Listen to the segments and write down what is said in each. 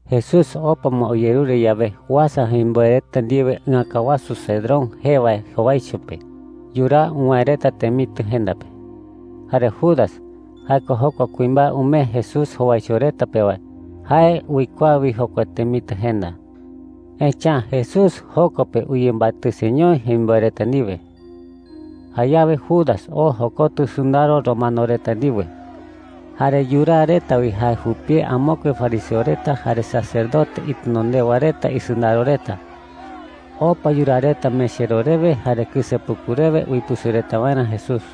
Jesús opa ma uyerure yawe, uasa jemimboe reta ndiwe ɨäka wasu Cedrón jee wae jowaicho pe yuraa uwäe reta temitɨ jenda pe. Jare Judas – jae ko jokua kuimbae umee Jesús jowaicho reta pe wae – jae uikuaa wi jokua temitɨ jenda. Echa’ä Jesús joko pe uyembatɨseñoi jemimboe reta ndiwe. Jayawe Judas oo jokotɨ sɨndaro romano reta ndiwe. Jare yuraa reta wi jae jupie amokue fariseo reta jare sacerdote itenondewa reta isɨndaro reta. Opa yuraa reta mechero rewe jare kɨsepuku rewe uipɨsɨ reta waerä Jesús.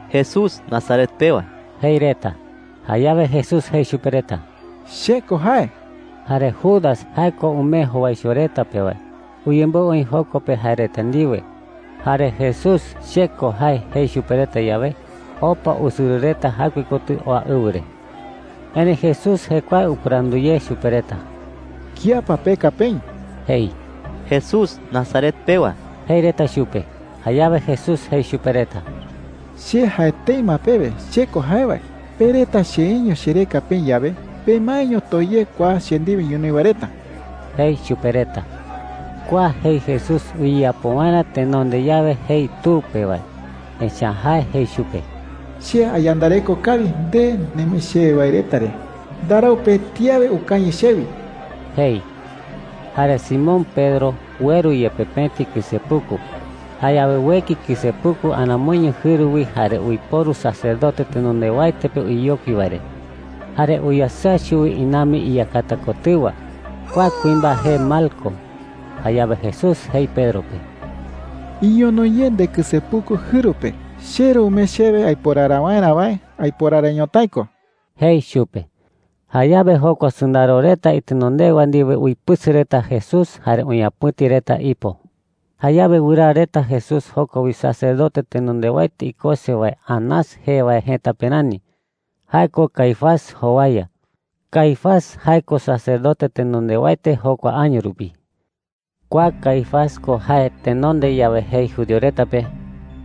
“Jesús Nazaret pewa,” jei reta. Jayawe Jesús jei chupe reta: “CHE KO jae.” Jare Judas – jae ko umee jowaicho reta pe wae – uyemboɨ oï joko pe jae reta ndiwe. Jare Jesús “CHE KO jae” jei chupe reta yawe, opa usɨrɨ reta jaɨkue kotɨ oa ɨwɨ re. Erëi Jesús jekuae upɨrandu ye chupe reta: “¿Kía pa peka peï?” jei. “Jesús Nazaret pewa,” jei reta chupe. Jayawe Jesús jei chupe reta: “Che jae tëi ma pewe CHE KO jae wae. Pe reta cheeño chereka peï yawe, pemaeño too ye kua che ndiwe ñonoï wae reta,” jei chupe reta. Kua jei Jesús uyeyapo waerä tenonde yawe jei Tu pe wae. Echa’ä jae jei chupe: “Che ayandareko kawi nde nemee chewe wae reta re. Ndarau pëti awe ukañɨ chewi,” jei. Jare Simón Pedro ueru yepe pëti kɨsepuku. Jayawe ueki kɨsepuku aramoiño jɨru wi jare uiporu sacerdote tenondewaete pe uyeyokui wae re. Jare uyasɨa chuwi inambi iyakata kotɨwa. Kua kuimbae jee Malco. Jayawe Jesús jei Pedro pe: “Iñono ye ndekɨsepuku jɨru pe. CheRu umee chewe aiporara waerä wae, aiporara ñotái ko,” jei chupe. Jayawe jokua sɨndaro reta itenondewa ndiwe uipɨsɨ reta Jesús jare uñapɨ̈ti reta ipo. Jayawe wɨraa reta Jesús joko wi sacerdote tenondewaete ikose wae Anás jee wae jëta pe rani – jae ko Caifás jowaya. Caifás jae ko sacerdote tenondewaete jokua año rupi. Kua Caifás ko jae tenonde yawe jei judío reta pe: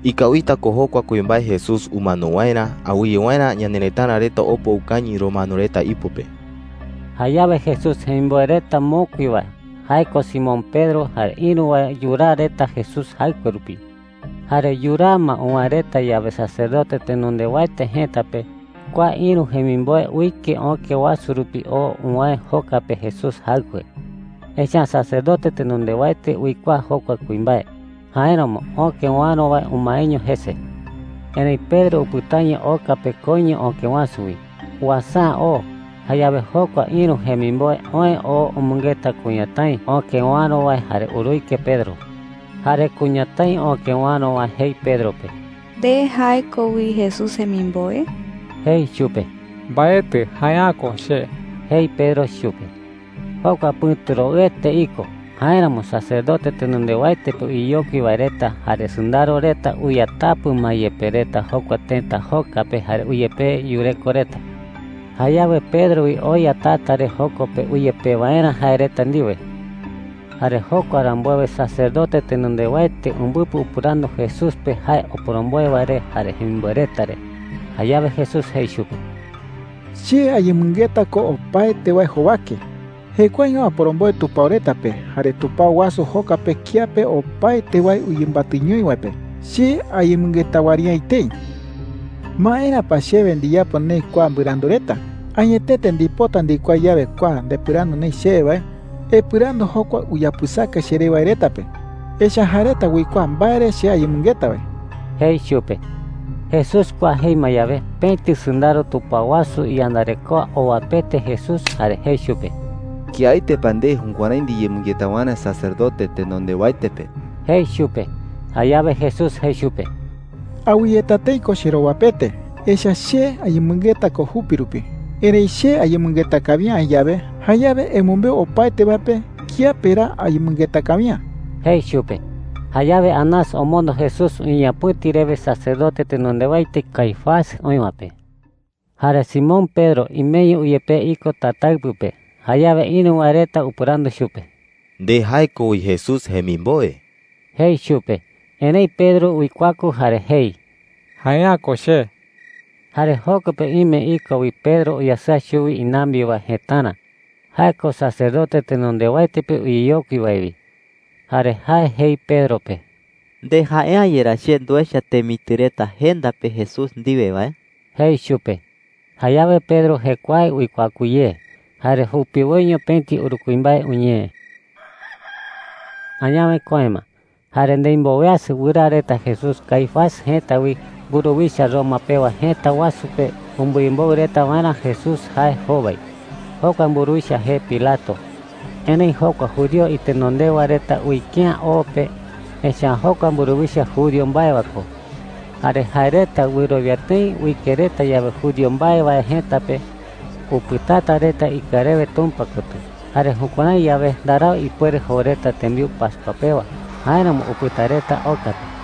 “Ikawita ko jokua kuimbae Jesús umano waerä awɨye waerä ñanerëtara reta opa ukañɨ romano reta ipo pe.” Jayawe Jesús jemimboe reta mokui wae – jae ko Simón Pedro jare ïru wae – yuraa reta Jesús jaɨkue rupi. Jare yuraa ma uwäe reta yawe sacerdote tenondewaete jëta pe, kua ïru jemimboe uike öke wasu rupi oo uwäe joka pe Jesús jaɨkue. Echa’ä sacerdote tenondewaete uikuaa jokua kuimbae; jáeramo öke uäro wae umaeño jese. Erëi Pedro upɨtaño oka pe koiño öke wasu wi. Uasa’ä oo. Jayawe jokua ïru jemimboe oë oo umɨngeta kuñatái öke uäro wae jare uruike Pedro. Jare kuñatái öke uäro wae jei Pedro pe: “¿Nde jae ko wi Jesús jemimboe?” jei chupe. “Mbaetɨ. Jae’ä ko che,” jei Pedro chupe. Jokua pɨ̈tu roɨete iko. Jáeramo sacerdote tenondewaete pe uyeyokui wae reta jare sɨndaro reta uyatapɨ ma yepe reta jokua tëta joka pe jare uyepee yureko reta. Jayawe Pedro wi oya tata re, joko pe uyepee waerä jae reta ndiwe. Jare jokua rambuewe sacerdote tenondewaete umbɨpɨ upɨrandu Jesús pe jae oporomboe wae re jare jemimboe reta re. Jayawe Jesús jei chupe: “Che ayemɨngeta ko opaete wae jowake. Jekuaeño aporomboe tupao reta pe jare tupao wasu joka pe kiape opaete wae uyembatɨñoi wae pe. Che ayemɨngeta wɨari’ä etei,” jei chupe. “¿Maera pa chewe ndiyapo neï kua mbɨrandu reta? Añetete ndipota ndikuaa yawe kua ndepɨrandu neï chewe wae, epɨrandu jokua uyapɨsaka cheré wae reta pe. Echa’ä jae reta uikuaa mbae re che ayemɨngeta wae,” jei chupe. Jesús kua jei ma yawe, pëti sɨndaro tupao wasu iyandarekoa owapete Jesús jare jei chupe: “¿Kiaete pa nde jukuärái ndiyemɨngeta waerä sacerdote tenondewaete pe?” jei chupe. Jayawe Jesús jei chupe: “Awɨyeta tëi ko cherowapete, echa’ä che ayemɨngeta ko jupi rupi. Erëi che ayemɨngeta kawi’ä aï yawe, jayawe emɨmbeu opaete wae pe kiape ra ayemɨngeta kawi’ä,” jei chupe. Jayawe Anás omondo Jesús uñeñapɨ̈ti rewe sacerdote tenondewaete Caifás oï wae pe. Jare Simón Pedro imeño uyepee iko tataɨpɨ pe. Jayawe ïru wae reta upɨrandu chupe: “¿Nde jae ko wi Jesús jemimboe?” jei chupe. Erëi Pedro uikuaku jare jei: “Jae’ä ko che.” Jare joko pe ime iko wi Pedro uyasɨa chuwi inambi wae jëtara. Jae ko sacerdote tenondewaete pe uyeyokui wae wi. Jare jae jei Pedro pe: “¿Nde jae’ä yerá che nduecha temitɨ reta jenda pe Jesús ndiwe wae?” jei chupe. Jayawe Pedro jekuae uikuaku ye. Jare jupiwoiño pëti uru kuimbae uñee. Añawe köe ma jare ndimboweasɨ wɨraa reta Jesús Caifás jëta wi mburuwicha Roma pewa jëta wasu pe umbɨyemboɨ reta waerä Jesús jae jowai. Jokua mburuwicha jee Pilato. Erëi jokua judío itenondewa reta uike’ä o pe, echa’ä jokua mburuwicha judío mbae wae ko. Jare jae reta wɨrowia tëi uike reta yawe judío mbae wae jëta pe, upɨtata reta ikɨa rewe Tumpa kotɨ. Jare jukuärái yawe, ndarau ipuere jou reta tembiu pascua pewa. Jáeramo upɨta reta oka pe.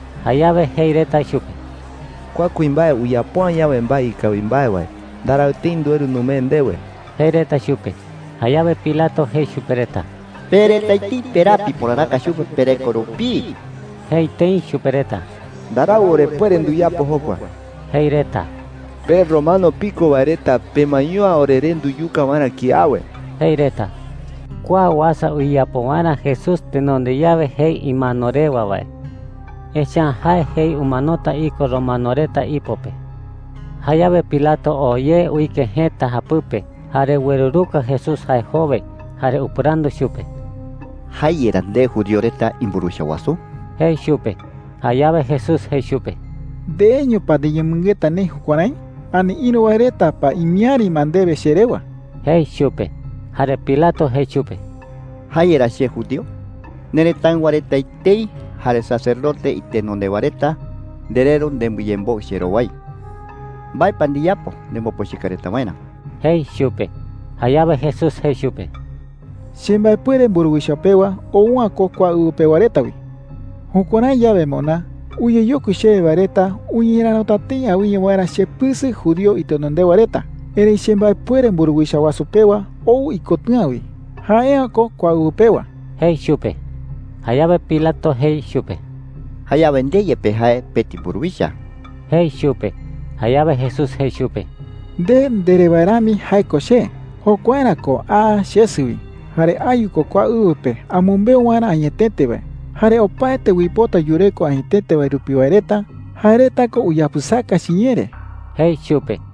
Jayawe jei reta chupe: “Kua kuimbae uyapo’ä yawe mbae ikawi mbae wae, ndarau tëi ndueru numee ndewe,” jei reta chupe. Jayawe Pilato jei chupe reta: “Pe reta etei peraa piporaraka chupe pereko rupii,” jei tëi chupe reta. “Ndarau orepuere nduyapo jokua,” jei reta. “Pe romano piko wae reta pemaeño’ä oreré nduyuka waerä kiawe,” jei reta. Kua uasa uyeyapo waerä Jesús tenonde yawe jei imano rewa wae. Echa’ä jae jei umanota iko romano reta ipo pe. Jayawe Pilato oo ye uike jëta japɨpe jare ueruruka Jesús jae jowai. Jare upɨrandu chupe: “¿Jae yerá nde judío reta imburuwicha wasu?” jei chupe. Jayawe Jesús jei chupe: “¿Ndeeño pa ndiyemɨngeta neï jukuärái, ani ïru wae reta pa imiäri ma ndewe che rewa?” jei chupe. Jare Pilato jei chupe: “¿Jae yerá che judío? Nerëtáɨwa reta etei jare sacerdote itenondewa reta ndereru nembɨyemboɨ cherowai. ¿Mbae pa ndiyapo nembopochɨka reta waerä?” jei chupe. Jayawe Jesús jei chupe: “Chembaepuere mburuwicha pewa ou’ä ko kua ɨwɨ pewa reta wi,” jei. “Jukuärái yawe moná, uyeyokui chewe wae reta uñerärota tëi awɨye waerä chepɨsɨ judío itenondewa reta. Erëi chembaepuere mburuwicha pewa ou ikotɨ̈a wi. Jae’ä ko kua ɨwɨ pewa,” jei chupe. Jayawe Pilato jei chupe: “Jayawe nde yepe jae pëti mburuwicha,” jei chupe. Jayawe Jesús jei chupe: “Nde ndere wae rami jae ko che. Jokuaerä ko aa chesɨ wi. Jare ayu ko kua ɨwɨ pe amɨmbeu waerä añetete wae. Jare opaete uipota yureko añetete wae rupi wae reta, jae reta ko uyapɨsaka chiñee re,” jei chupe.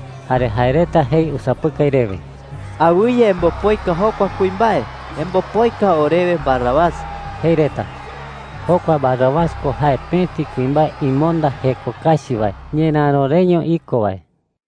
Jare jae reta jei usapɨkai rewe: “¡Awɨye embopoika jokua kuimbae! ¡Embopoika orewe Barrabás!” jei reta. Jokua Barrabás ko jae pëti kuimbae imonda jeko kachi wae ñeräro reño iko wae.